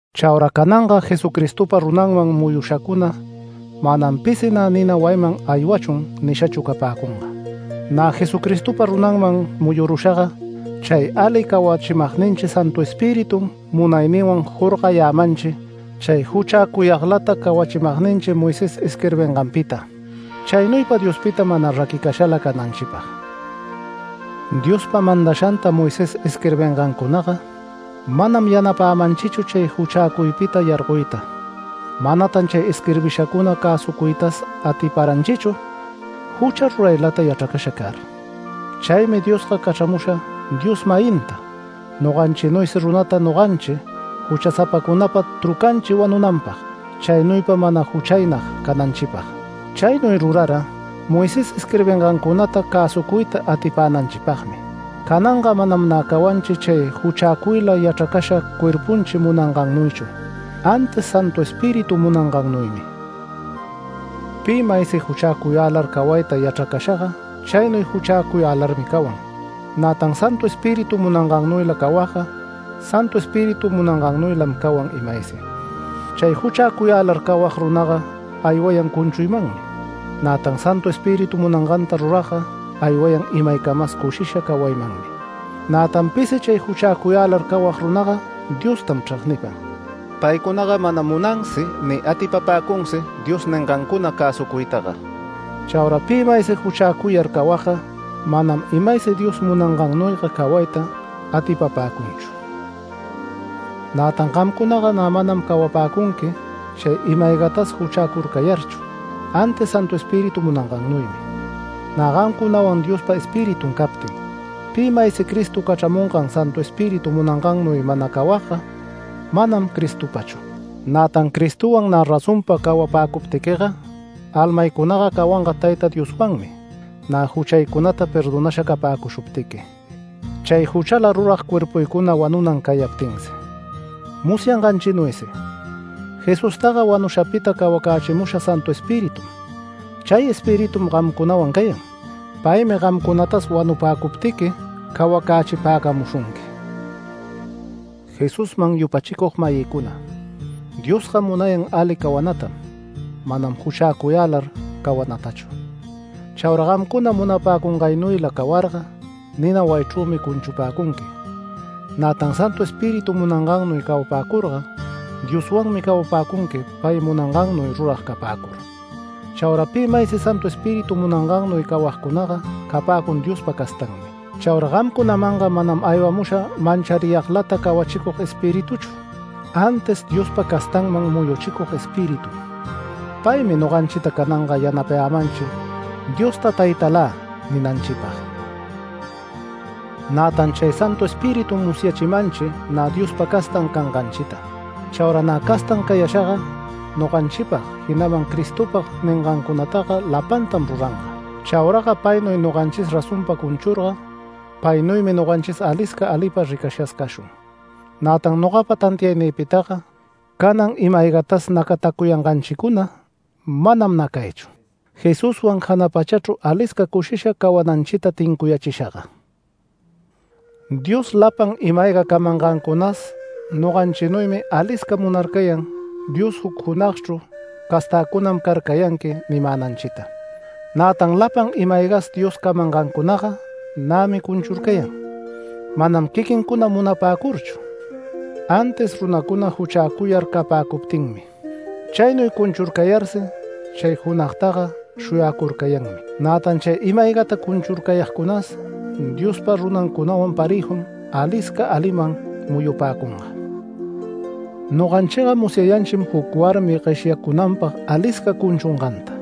Chaura cananga Jesucristopa runanman muyushacuna manam pisi nä “Nina wayiman aywachun” nishachu capäcunga. Nä Jesucristopa runanman muyurushaga, chay ali cawachimagninchi Santu Espiritum munayninwan jorgayämanchi chay juchäcuyaglata cawachimagninchi Moisés isquirbinganpita, chaynuypa Diospita mana raquicashala cananchipag. Diospa mandashanta Moisés isquirbingancunaga manam yanapämanchichu chay juchäcuypita yargoyta. Manatan chay isquirbishacuna cäsucuytas atiparanchichu jucha ruraylata yachracasha car. Chaymi Diosga cachramusha Dios-mayinta noganchinuysi runata noganchi juchasapacunapa trucanchi wanunanpag, chaynuypa mana juchaynag cananchipag. Chaynuy rurara, Moisés isquirbingancunata cäsucuyta atipänanchipagmi. Cananga manam nä cawanchi chay juchäcuyla yachracasha cuerpunchi munangannuychu, antis Santu Espíritu munangannuymi. Pi maysi juchäcuyälar cawayta yachracashaga chaynuy juchäcuyälarmi cawan. Nätan Santu Espíritu munangannuyla cawagga Santu Espíritu munangannuylam cawan imaysi. Chay juchäcuyälar cawag runaga aywayan cunchuymanmi, nätan Santu Espíritu munanganta ruragga aywayan imaycamas cushisha cawaymanmi. Nätan pisi chay juchäcuyälar cawag runaga Diostam chregnipan. Paycunaga manam munansi ni atipapäcunsi Dios ningancuna cäsucuytaga. Chaura pi maysi juchäcuyar cawagga, manam imaysi Dios munangannuyga cawayta atipapäcunchu. Nätan gamcunaga nä manam cawapäcunqui chay ima-aygatas juchäcurcayarchu, antis Santu Espíritu munangannuymi, nä gamcunawan Diospa Espiritun captin. Pi maysi Cristo cachramungan Santu Espíritu munangannuy mana cawagga manam Cristopachu. Nätan Cristowan nä razonpa cawapäcuptiquiga almaycunaga cawanga Tayta Dioswanmi nä juchaycunata perdonasha capäcushuptiqui, chay juchala rurag cuerpuycuna wanunan cayaptinsi. Musyanganchinuysi Jesustaga wanushapita cawacächimusha Santu Espiritum. Chay Espiritum gamcunawan cayan. Paymi gamcunatas wanupäcuptiqui cawacächipäcamushunqui. Jesusman yupachicug-mayïcuna, Diosga munayan ali cawanatam manam juchäcuyälar cawanatachu. Chaura gamcuna munapäcungaynuyla cawarga nina wayichrümi cunchupäcunqui, nätan Santu Espíritu munangannuy cawapäcurga Dioswanmi cawapäcunqui pay munangannuy rurag capäcur. Chaura pi maysi Santu Espíritu munangannuy cawagcunaga capäcun Diospa castanmi. Chaura gamcunamanga manam aywamusha manchariyaglata cawachicug Espirituchu, antis Diospa castanman muyuchicug Espiritum. Paymi noganchita cananga yanapayämanchi Diosta “Taytalä” ninanchipag. Nätan chay Santu Espiritum musyachimanchi nä Diospa castan canganchita. Chaura nä castan cayashaga, noganchipag, jinaman Cristopag ningancunataga lapantam ruranga. Chauraga paynuy noganchis razonpa cunchurga, paynuymi noganchis alisca alipa ricashas cashun. Nätan nogapa tantiaynïpitaga canan ima-aygatas nacatacuyanganchicuna manam nacaychu, Jesuswan jana pachachru alisca cushisha cawananchita tincuyächishaga. Dios lapan ima-ayga camangancunas noganchinuymi alisca munarcayan Dios juc junagchru “Castäcunam carcayanqui” nimänanchita. Nätan lapan ima-aygas Dios camangancunaga nämi cunchurcayan, manam quiquincuna munapäcurchu, antis runacuna juchäcuyar capäcuptinmi. Chaynuy cunchurcayarsi chay junagtaga shuyacurcayanmi. Nätan chay ima-aygata cunchurcayagcunas Diospa runancunawan parëjum alisca aliman muyupäcunga. Noganchiga musyayanchim, juc warmi gueshyacunanpag alisca cunchunganta.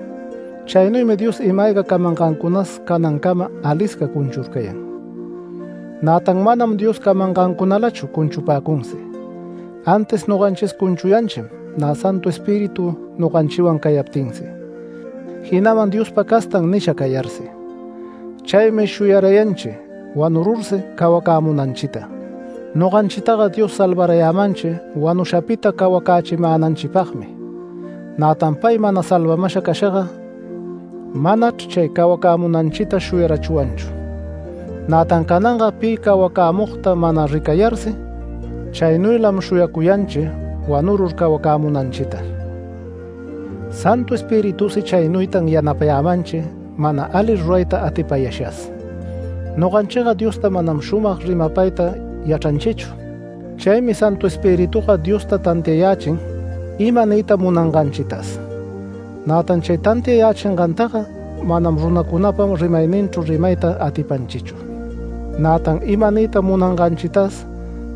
Chaynuymi Dios ima-ayga camangancunas canancama, alisca cunchurcayan. Nätan manam Dios camangancunalachu cunchupäcunsi, antis noganchis cunchuyanchim nä Santu Espíritu noganchiwan cayaptinsi, jinaman “Diospa castan” nisha cayarsi, chaymi shuyarayanchi wanurursi cawacämunanchita. Noganchitaga Dios salvarayämanchi wanushapita cawacächimänanchipagmi, nätan pay mana salvamasha cashaga manachr chay cawacämunanchita shuyarachwanchu. Nätan cananga pi cawacämugta mana ricarayarsi, chaynuylam shuyacuyanchi wanurur cawacämunanchita. Santu Espiritusi chaynuytan yanapayämanchi mana ali rurayta atipayashas. Noganchiga Diosta manam shumag rimapayta yachranchichu. Chaymi Santu Espirituga Diosta tantiayächin ima niyta munanganchitas. Nätan chay tantiayächingantaga manam runacunapa rimayninchru rimayta atipanchichu. Nätan ima niyta munanganchitas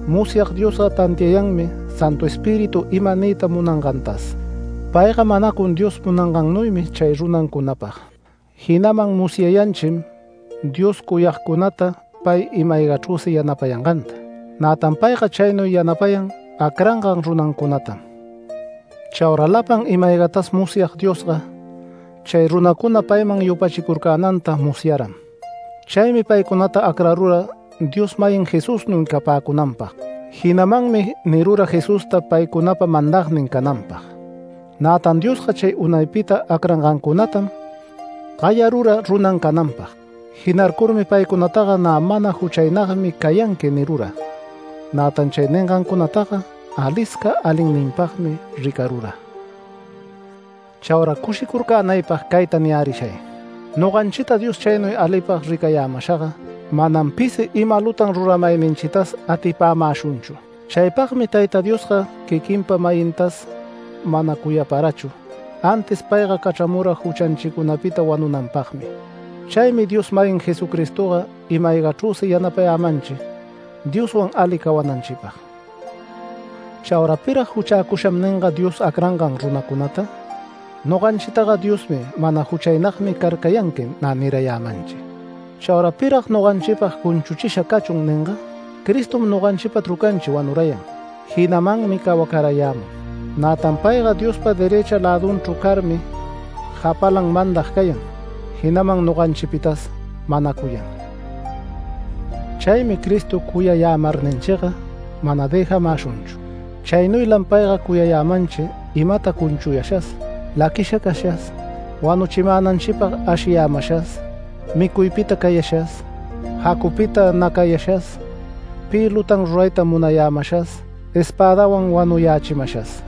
musyag Diosga tantiayanmi Santu Espíritu ima niyta munangantas. Payga manacun Dios munangannuymi chay runancunapag. Jinaman musyayanchim Diosta cuyagcunata pay ima-aygachrüsi yanapayanganta. Nätan payga chaynuy yanapayan acrangan runancunatam. Chaura lapan ima-aygatas musyag Diosga, chay runacuna payman yupachicurcänanta musyaram. Chaymi paycunata acrarura Dios-mayin Jesusnuy capäcunanpag, jinamanmi nirura Jesusta paycunapa mandagnin cananpag. Nätan Diosga chay unaypita acrangancunatam gayarura runan cananpag. Jinarcurmi paycunataga “Nä mana juchaynagmi cayanqui” nirura. Nätan chay ningancunataga alisca alinninpagmi ricarura. Chaura cushicurcänaypag cayta niyärishay: Noganchita Dios chaynuy alipag ricayämashaga manam pisi ima lutan ruramayninchitas atipämäshunchu. Chaypagmi Tayta Diosga quiquinpa-mayintas mana cuyaparachu, antis payga cachramura juchanchicunapita wanunanpagmi. Chaymi Dios-mayin Jesucristoga ima-aygachrüsi yanapayämanchi Dioswan ali cawananchipag. Chaura ¿pirag “Juchäcusham” ninga Dios acrangan runacunata? Noganchitaga Diosmi “Mana juchaynagmi carcayanqui” nä nirayämanchi. Chaura ¿pirag noganchipag “Cunchuchisha cachun” ninga? Cristom noganchipa trucanchi wanurayan, jinamanmi cawacarayämun. Nätan payga Diospa derëcha lädunchru carmi japalan mandag cayan, jinaman noganchipitas manacuyan. Chaymi Cristo cuyayämarninchiga mana dëjamäshunchu. Chaynuylam payga cuyayämanchi imata cunchuyashas, laquisha cashas, wanuchimänanchipag ashiyämashas, micuypita cayashas, jacupita nacayashas, pi lutan rurayta munayämashas, espädawan wanuyächimashas.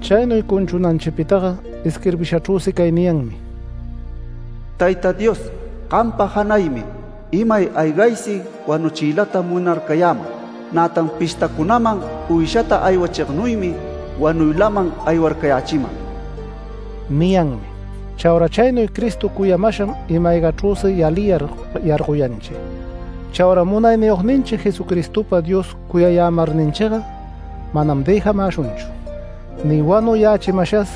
Chaynuy cunchunanchipitaga isquirbishachrüsi cay niyanmi: “Tayta Dios gampa janaymi imay aygaysi wanuchiylata munarcayäman. Nätan pishtacunaman uyshata aywachignuymi wanuylaman aywarcayächiman” niyanmi. Chaura chaynuy Cristo cuyamasham ima-aygachrüsi yaliyar yargoyanchi. Chaura Munayniyogninchi Jesucristopa Dios cuyayämarninchiga manam dëjamäshunchu, ni wanuyächimashas,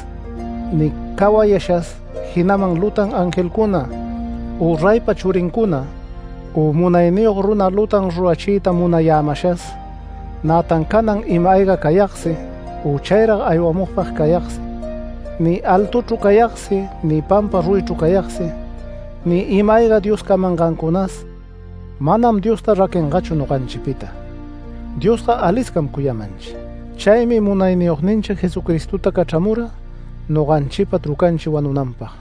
ni cawayashas, jinaman lutan angelcuna, u reypa churincuna, u munayniyog runa lutan rurachiyta munayämashas. Nätan canan ima-ayga cayagsi u chayrag aywamugpag cayagsi, ni altuchru cayagsi ni pampa ruyichru cayagsi, ni ima-ayga Dios camangancunas. Manam Diosta raquingachu noganchipita, Diosga aliscam cuyamanchi. Chaymi Munayniyogninchi Jesucristota cachramura noganchipa trucanchi wanunanpag.